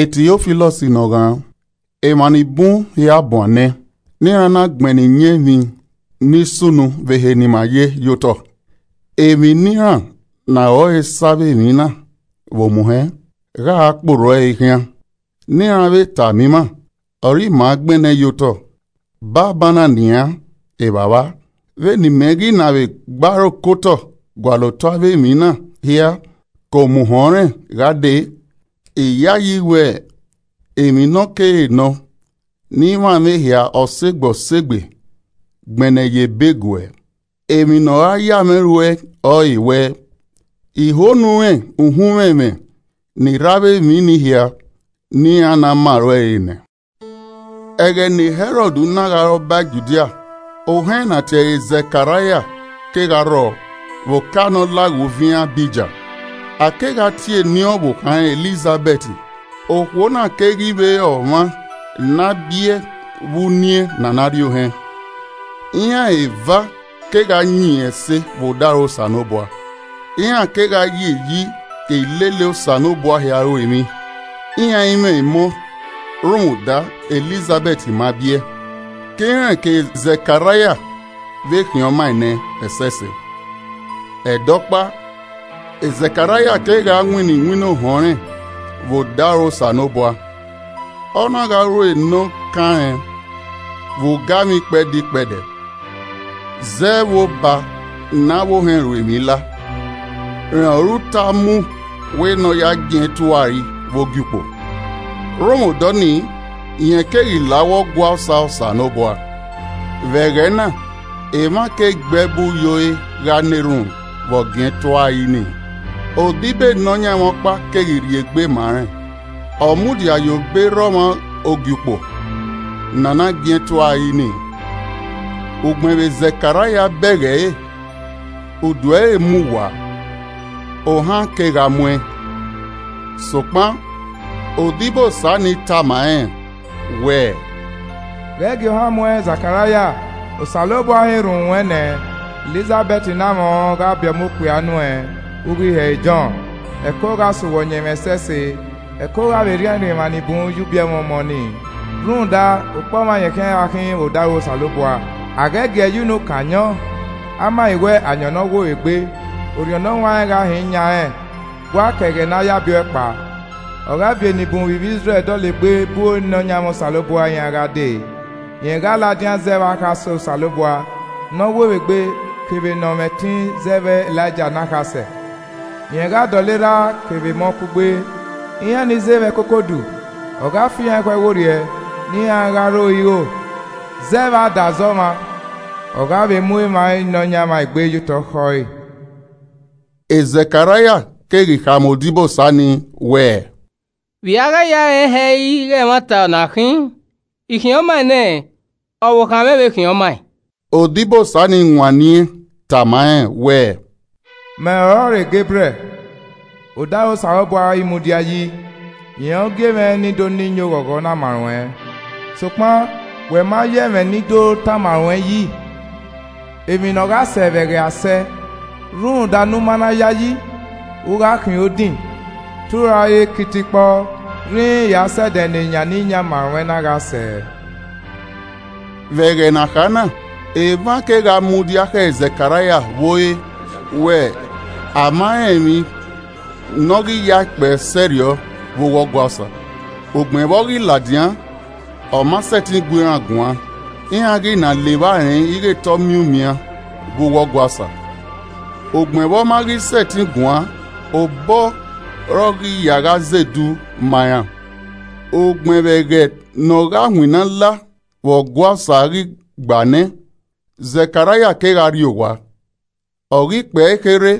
Tiofilọs ne ọ ghan: Emwa ni bun, hia buan nẹ, ne iran na gbennẹẹn iyẹn emwi ni sunu vbe ehe ne ima ye ye otọ. Emwi ne iran ne aro ẹre sẹ avbe emwi na vbe omuhẹn, gha kpe orhu ẹre khian, ne iran vbe tama ima, ọre iran gbẹnnẹ ye otọ. Banbanna nian, Evbavba, vbene imẹ ghi na vbe gbe aro ke otọ gualọ otọ avbe emwi na hia ke omuhẹn ọnrẹn gha dee, I yayi wẹ emwi ne ọkere nọ ne I mwamwa ehia ọsegbe ọsegbe gbẹnnẹ ye ebe guẹ. Emwi ne ọ ra ya mwẹ ru ẹe ọrọre wẹẹ, I ho ne u rẹn uhunmwu ẹmwẹ ni rre avbe emwi ni hia ne iran na ma ruẹn re nẹ. Ẹghẹ ne Hẹrọd na gha re Ọba Judia, ohẹn ne a tie ẹre Zẹkaraia kegha rrọọ vbe oka ne ọ laghe uviẹn Abija. A kegha tie eni ọvbokhan rẹn Elizahẹt, Okhuo na keghi vbe re ọmwa ne a biẹe vbe uniẹn ne a na rri ohẹn. Iran eva kegha yin ẹse vbe odaro Osanobua. Iran kegha ye iyi ke ilele Osanobua hia ru emwi. Iran i mwẹ emọ rhunmwuda Elizabẹt ma biẹ, ke irẹn kevbe Zẹkaraia vbe khian ọmaẹn nẹ ẹsẹse. Ẹdẹ ọkpa, Zẹkaraia kegha winna iwinna ohẹn ọnrẹn vbe odaro Osanobua, ọ na gha ru nọ kan rẹn vbe ugamwẹ ikpẹdẹ ikpẹdẹ. Zẹ vbe obọ ne avbe ohẹn ru emwi la, rẹn ọre uta mu wẹ ne ọ ya giẹn eturari vbe ogiukpo. Rhunmwuda ọnii, rẹn keghi la uwu Ọgua Osa Osanobua. Vbe ẹghẹ na, emwa ke gbe ẹbu ye ore gha na erhunmwu vbe a giẹn eturari nii. Odibo Nọyaẹnmwa ọkpa keghi rhie egbe ma rẹn, ọ mudia ye obọ erha ọmwa ogiukpo ne a na giẹn eturari nii. Ugbẹn vbe Zẹkaraia bẹghe ẹre, udu ẹre mu waa, ohan kegha mu ẹn. Sokpan odibosa nii tama rẹn wẹẹ, “Ghẹ gie ohan mu ẹn Zẹkaraia, Osanobua họn erhunmwu ruẹn nẹ, Elizabẹt ne amwẹ ọẹn gha biẹ ọmọ okpia nuẹn. U ghi he ẹre Jọn. Ẹko gha sẹ uwẹ ọyẹnmwẹ ẹsẹse, ẹko gha vbe rhiẹnrhiẹn emwa ni bun ye ubiẹmwẹ ọmọ ni. Rhunmwuda okpọmwa rẹn khian gha khin vbe odaro Osanobua. A ghẹ giee ye unu kan ayọn, a ma ghi wẹ ayọn ne ọ wo vbe egbe. Orhiọn Ne ọ huanrẹn gha hin yan rẹn wa ke ẹghẹ ne a ya biẹ ọe kpao. Ọ gha viọ enibun vbe ivbi Izrẹl dọlegbe bu Nọyaẹnmwa Osanobua iran gha dee. Rẹn gha ladian zẹ vbe akhasẹ Osanobua ne ọ wo vbe egbe kevbe ne ọ mwẹ ẹtin zẹ vbe Elaija ne akhasẹ. Rẹn gha dọlọ erha kevbe emọ kugbe. Iran ni ze vbe ẹkoko udu, ọ gha fi iran ekhọe werriẹ ne iran gha ro iro zẹ vbe adazẹ ọmwa. Ọ gha mu emwa Nọyaẹnmwa egbe ye otọ khẹ ọre.” Zẹkaraia keghi khama odibosa ni wẹẹ, “Vbe i a gha ya rẹn hẹ ighẹ ẹmwata ọ na khin? I khian ọmaẹn nẹ, ọvbokhan mwẹ vbe khian ọmaẹn.” Odibosa nii wanniẹn tama rẹn wẹẹ, “Mẹ ọrọre Gebriẹl, odaro Osanobua ọre I mudia yi, rẹn ọre ọ gie mwẹ ne I do na iyẹn oghọghọ na ma ruẹn. Sokpan, wẹ ma ya ẹmwẹ ne I do tama ruẹn yi, ẹmwẹ ne ọ gha sẹ vbe ẹghẹ a sẹ. Rhunmwuda ne u ma na yayi na, u gha khian odin. Te u ra ye kitikpọ, rhinrin ya sẹ ẹdẹ ne eyan ne I yan ma ruẹn na gha sẹ.” Vbe ẹghẹ ne a kha na, emwa kegha mudia khẹ Zẹkaraia vbe ore wẹ a ma rẹn emwi ne ọ ghi yae kpẹe sẹrriọ vbe uwu Ọgua Osa. Ugbẹn vbe ọ ghi ladian, ọ ma sẹtin gu iran guan, iran ghi na la evba rẹn ighe te ọ miẹn umian vbe uwu Ọgua Osa. Ugbẹn vbe ọ ma ghi sẹtin guan, obọ ọre ọ ghi ya zẹ edu ma iran. Ugbẹn vbe ẹghẹ ne ọ gha winna la vbe Ọgua Osa ghi gba nẹ, Zẹkaraia kegha rrie owa. Ọ ghi kpẹe kherhe,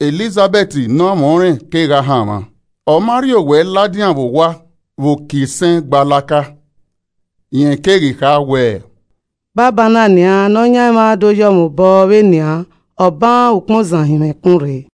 Elizabẹt ne amwẹ ọnrẹn kegha hanmwa, ọ ma rhie owẹ ladian vbe owa vbe uki isẹn gbalaka. Rẹn keghi kha wẹẹ, “Banbanna nian, Nọyaẹnmwa do yọ mwẹ obọ vbe nian, ọ han ukpọn ozan hin mwẹ ẹkun rre.”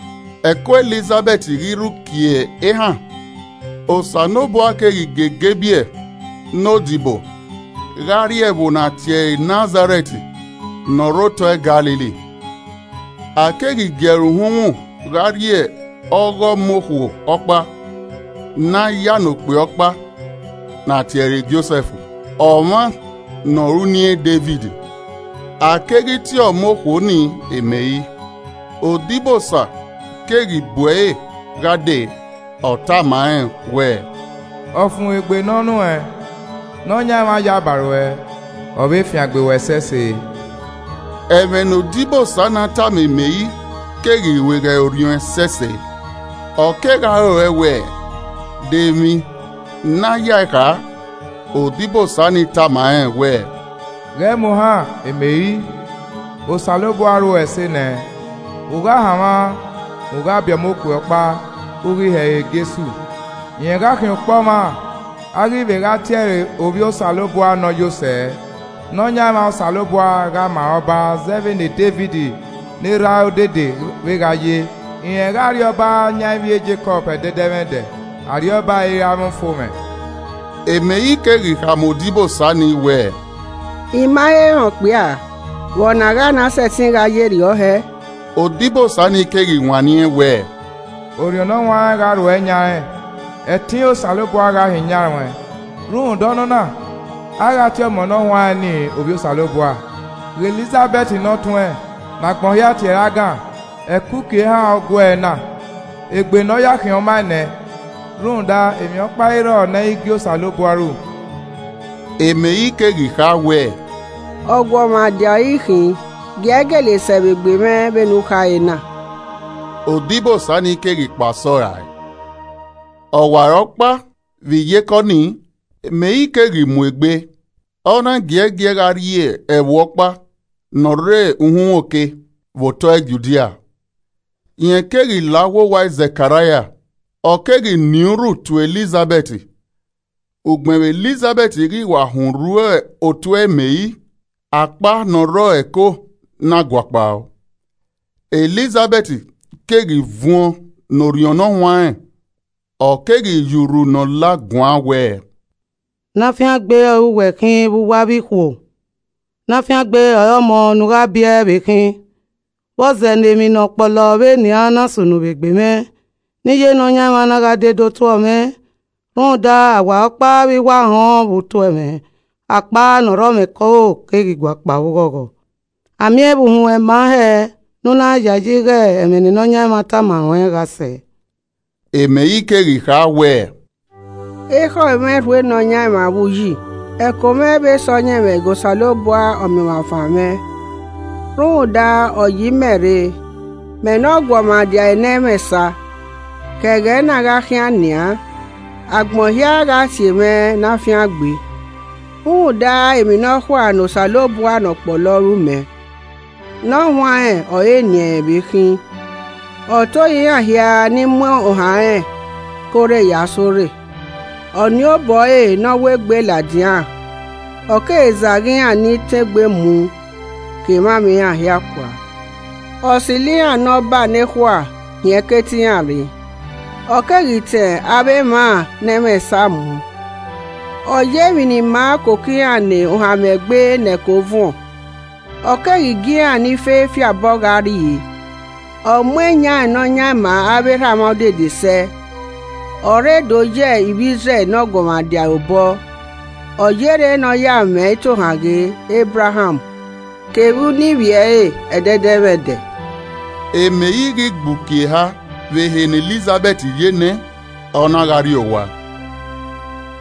Ẹko Elizabẹt ghi rre uki ehan, Osanobua keghi gie Gebriẹl ne odibo gha rrie ẹvbo ne a tie ẹre Nazarẹt ne ọ rre otọ Galili. A keghi gie ẹre uhunmwu gha rrie ọghe ọmọ okhuo ọkpa ne a ya ne okpia ọkpa ne a tie ẹre Josẹf, ọmwa ne ọre uniẹn Devid. A keghi tie ọmọ okhuo nii Meri. Odibosa keghi bu ẹre gha dee, ọ tama rẹn wẹẹ, “Ọfumwegbe nọ nuẹn. Nọyaẹnmwa yaba ruẹ, ọ vbe fiangbe uẹ ẹsẹse.” Ẹmwẹ ne odibosa na tama Meri keghi rueghe ẹre orhiọn ẹsẹse, ọ kegha rorẹe wẹ, De emwi ne a yae kha. Odibosa nii na tama rẹn wẹẹ, “Ghẹ mu ohan Meri, Osanobua ruẹ ẹse nẹ. U gha hanmwa, u gha biẹ ọmọ okpia ọkpa, u ghi he ẹre Jesu. Rẹn gha khian okpọmwa, a ghi vbe gha tie ẹre Ovbi Osanobua Ne Ọ Yọ Sẹ, Nọyaẹnmwa Osanobua gha ma ẹn re ọba zẹ vbe ne Devid ne erhae odede vbe gha ye. Rẹn gha rriọba yan ivbi e Jekọb ẹdẹdẹmwẹdẹ, arriọba ẹre ẹ i ra mwẹ ufomwẹ.” Meri keghi khama odibosa nii wẹẹ, “I ma he rẹn okpia, vbe ọ na a gha na sẹtin gha ye rriọ hẹ.” Odibosa ni keghi wanniẹn wẹẹ, “Orhiọn Ne Ọ Huanrẹn gha rhuẹ yan ruẹn. Ẹtin Osanobua gha hin yan ruẹn. Rhunmwuda ọnọna, a gha tie ọmọ ne ọ huanrẹn ni Ovbi Osanobua. Ghe, Elizabẹt ne ọtuẹn, ne agbọn hia tie ẹre agan, ẹko uki ehan ọre ọ guee na, egbe ne ọ ya khian ọmaẹn nẹ. Rhunmwuda emwi ọkpa i rrọọ ne ẹ i gie Osanobua ru.” Meri keghi kha wẹẹ, “Ọguọmwadia ọre I khin, gie ẹe gele sẹ vbe egbe mwẹ vbe ne u khare na.” Odibosa nii keghi kpa sẹ ọe rae. Ọwarọkpa vbe iyeke ọnii, Meri keghi mu egbe, ọ na giẹgiẹ gha rrie ẹvbo ọkpa ne ọ rre uhunmwu oke, vbe otọe Judia. Rẹn keghi la uwu owa Zẹkaraia, ọ keghi nien urhu tuẹ Elizabẹt. Ugbẹn vbe Elizabẹt ghi wa họn urhu otuẹ e Meri, akpa ne ọ rre ẹre ẹko na guakpao. Elizabẹt keghi vuọn ne orhiọn Ne ọ huanrẹn. Ọ keghi ye urhu nọ la guan wẹẹ, “Ne a fiangbe ọre uwẹ khin vbe uwu avbe ikhuo. Ne a fiangbe ọre ọmọ ne u gha biẹ vbe khin. Vbe ọ zẹ ne emwi ne ọ kpọlọ vbe nian na sunu vbe egbe mwẹ, ne iye Nọyaẹnmwa na gha de do tuẹ mwẹ? Rhunmwuda, ọwarọkpa vbe I wa họn vbe u tuẹ mwẹ, akpa ne ọ rrọ mwẹ ẹko keghi guakpao vbe oghọghọ. A miẹn vbe uhunmwu ruẹn ma hẹẹ, ne u na yayi ighe ẹmwẹ ne Nọyaẹnmwa tama ruẹn gha sẹ!” Meri keghi kha wẹẹ: “Ekhọe mwẹ rho Nọyaẹnmwa vbe uyi, ẹko mwẹ vbe sọyẹnmwẹ ghe Osanobua Ọmiọnmwafan mwẹ, rhunmwuda, ọ ye imẹ rre, mẹ ne ọguọmwadia ẹre ne ẹ mwẹ esa! Ke ẹghẹ na gha khian nian, agbọn hia gha tie mwẹ ene afiangbe. Rhunmwuda, emwi nọkhua ne Osanobua ne ọ kpọlọ ru mẹ. Ne ọ huanrẹn ọre eni ẹnrẹn vbe khin. Ọ tohan iran hia ni mu ohan rẹn. Ke orre ya sẹ orre. Ọ nien obọ ẹre ne ọ wegbe ladian. Ọ keghi zagha iran ni tọn egbe mu kevbe emwamwa iran kua. Ọ silo iran ne ọba nekhua hin ẹkete iran rre. Ọ keghi tọn avbe emwa ne ẹ i mwẹ esa mu. Ọ ye emwi ni maa koko iran ne ohanmwẹ gbe ne ẹko vuọn. Ọ keghi gie iran ni fe fi abọ gha rrie. Ọ mu eyan ne ọ yan ma avbe erhamwa odede sẹ. Ọ rre do ye Izrẹl ne eguọmwadia ẹre obọ. Ọ yerre ne ọ ya mwẹ itohan ghe Ebraham. Kevbe uniẹn ivbi ẹre ẹdẹdẹmwẹdẹ!” Meri ghi gbe uki eha vbe ehe ne Elizabẹt ye nẹ, ọ na gha rrie owa.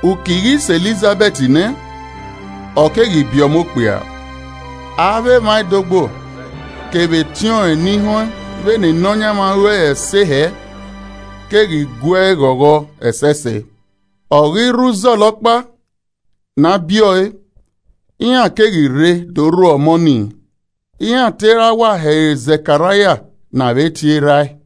Uki ghi sẹ Elizabẹt nẹ, ọ keghi biẹ ọmọ okpia. Avbe emwa ẹdogbo kevbe etiọnrẹn ni họn vbene Nọyaẹnmwa ru ẹre ẹse hẹ keghi gue ẹe ghọghọ ẹsẹse. Ọ ghi rre uzọla ọkpa ne a biẹ ọe, iran keghi rre do rhuẹ ọmọ nii, iran te ra wa he ẹre Zẹkaraia ne a vbe tie erhae.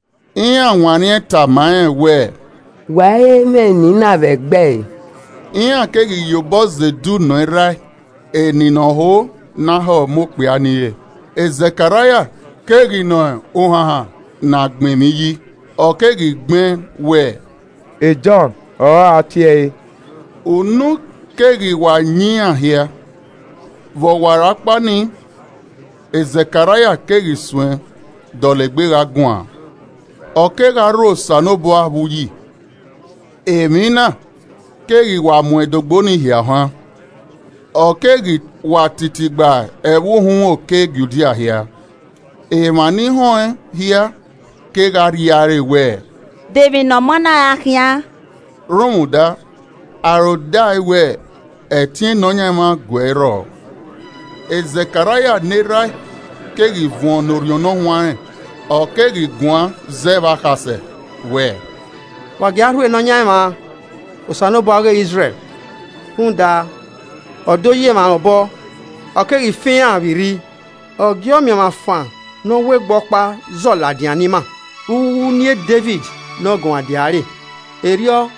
Iran wanniẹn tama rẹn wẹẹ, “Wa i he mwẹ eni na vbe ẹgbẹe.” Iran keghi ye obọ zẹ edu nọ erha ẹe eni ne ọ ho ne a he ọmọ okpia ni re. Zẹkaraia keghi nọ uhanhan ne a gbẹn emwi yi, ọ keghi gbẹn wẹẹ, “Jọn ọre a tie ẹre.” Unu keghi wa yan iran hia. Vbe ọwarọkpa ni Zẹkaraia keghi suẹ dọlegbe gha guan, ọ kegha rho Osanobua vbe uyi. Emwi na keghi wa mu ẹdogbo nii hia ohan, ọ keghi wa titi gba ẹvbo uhunmwu oke Judia hia. Emwa ni họn ẹn hia kegha rria ẹre wẹ, “De emwi ne ọmọ na ra khian?” Rhunmwuda aro dae wẹ ẹtin Nọyaẹnmwa gu ẹe rrọọ. Zẹkaraia ne erha ẹe keghi vuọn ne Orhiọn Ne Ọ Huanrẹn, ọ keghi guan zẹ vbe akhasẹ wẹẹ: “Wa gie a rho Nọyaẹnmwa Osanobua ọghe Izrẹl. Rhunmwuda ọ do ye emwa rẹn obọ, ọ keghi fan iran vbe irri. Ọ gie Ọmiọnmwafan ne ọ wegbe ọkpa zọ ladian ne ima, vbe uwu uniẹn Devid ne ọguọmwadia ẹre. Erriọ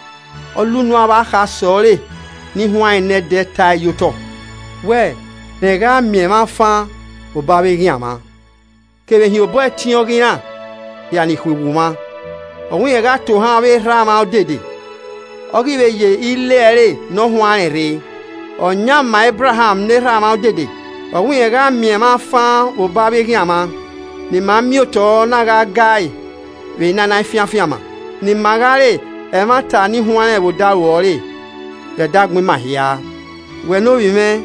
ọ la unu avbe akhasẹ ọre ni huanrẹn nẹdẹ tae ye otọ. Wẹ rẹn gha miẹn mwa fan vbe obọ avbe eghian mwa. Kevbe hin obọ ẹtin ọghe iran hia ni khuiwu mwa. Ọ wẹ rẹn gha tohan avbe erha mwa odede. Ọ ghi vbe ye ile ẹre ne ọ huanrẹn rre. Ọ yan ma Ebraham ne erha mwa odede. Ọ wẹ rẹn gha miẹn mwa fan vbe obọ avbe eghian mwa. Ne ima miẹn otọ na gha gae vbe ne a i na fian afianma. Ne ima gha re emwata ni huanrẹn vbe odaro ẹre. Vbe ẹdẹ agbọn ima hia. Wẹ ne ovbi mwẹ,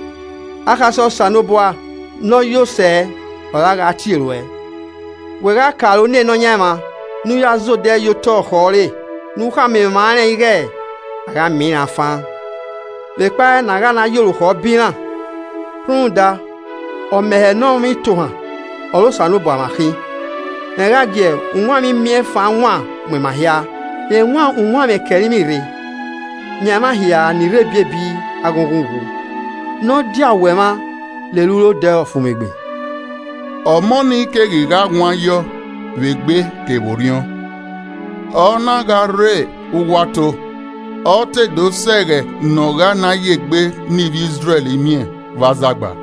akhasẹ Osanobua Ne Ọ Yo Sẹ, ọre a gha tie ruẹ. Wẹ gha ke aro ne Nọyaẹnmwa. Ne u ya zẹ odẹ ye otọ khẹ ọre. Ne u khama emwa rẹn ighe a gha miẹn iran fan. Vbe kpa ne a gha na ye orukhọ bọ iran. Rhunmwuda ọmẹhẹ ne ọmwa itohan ọre Osanobua mwa khin. Rẹn gha gie uwanmwẹ imiẹnfan wan mu ima hia. Rẹn wan uwanmwẹ ke ẹrinmwi rre, yan emwa hia ni rre ebiebi aghọnghọn uwu ne ọ dia owẹ mwa lele uro odẹ ọfumwegbe.” Ọmọ nii keghi gha wan yiọ vbe egbe kevbe orhiọn, ọ na gha rre uwu ato, ọ te do sẹ ẹghẹ ne ọ gha na ye egbe ne ivbi Izrẹl miẹn vbe azagba.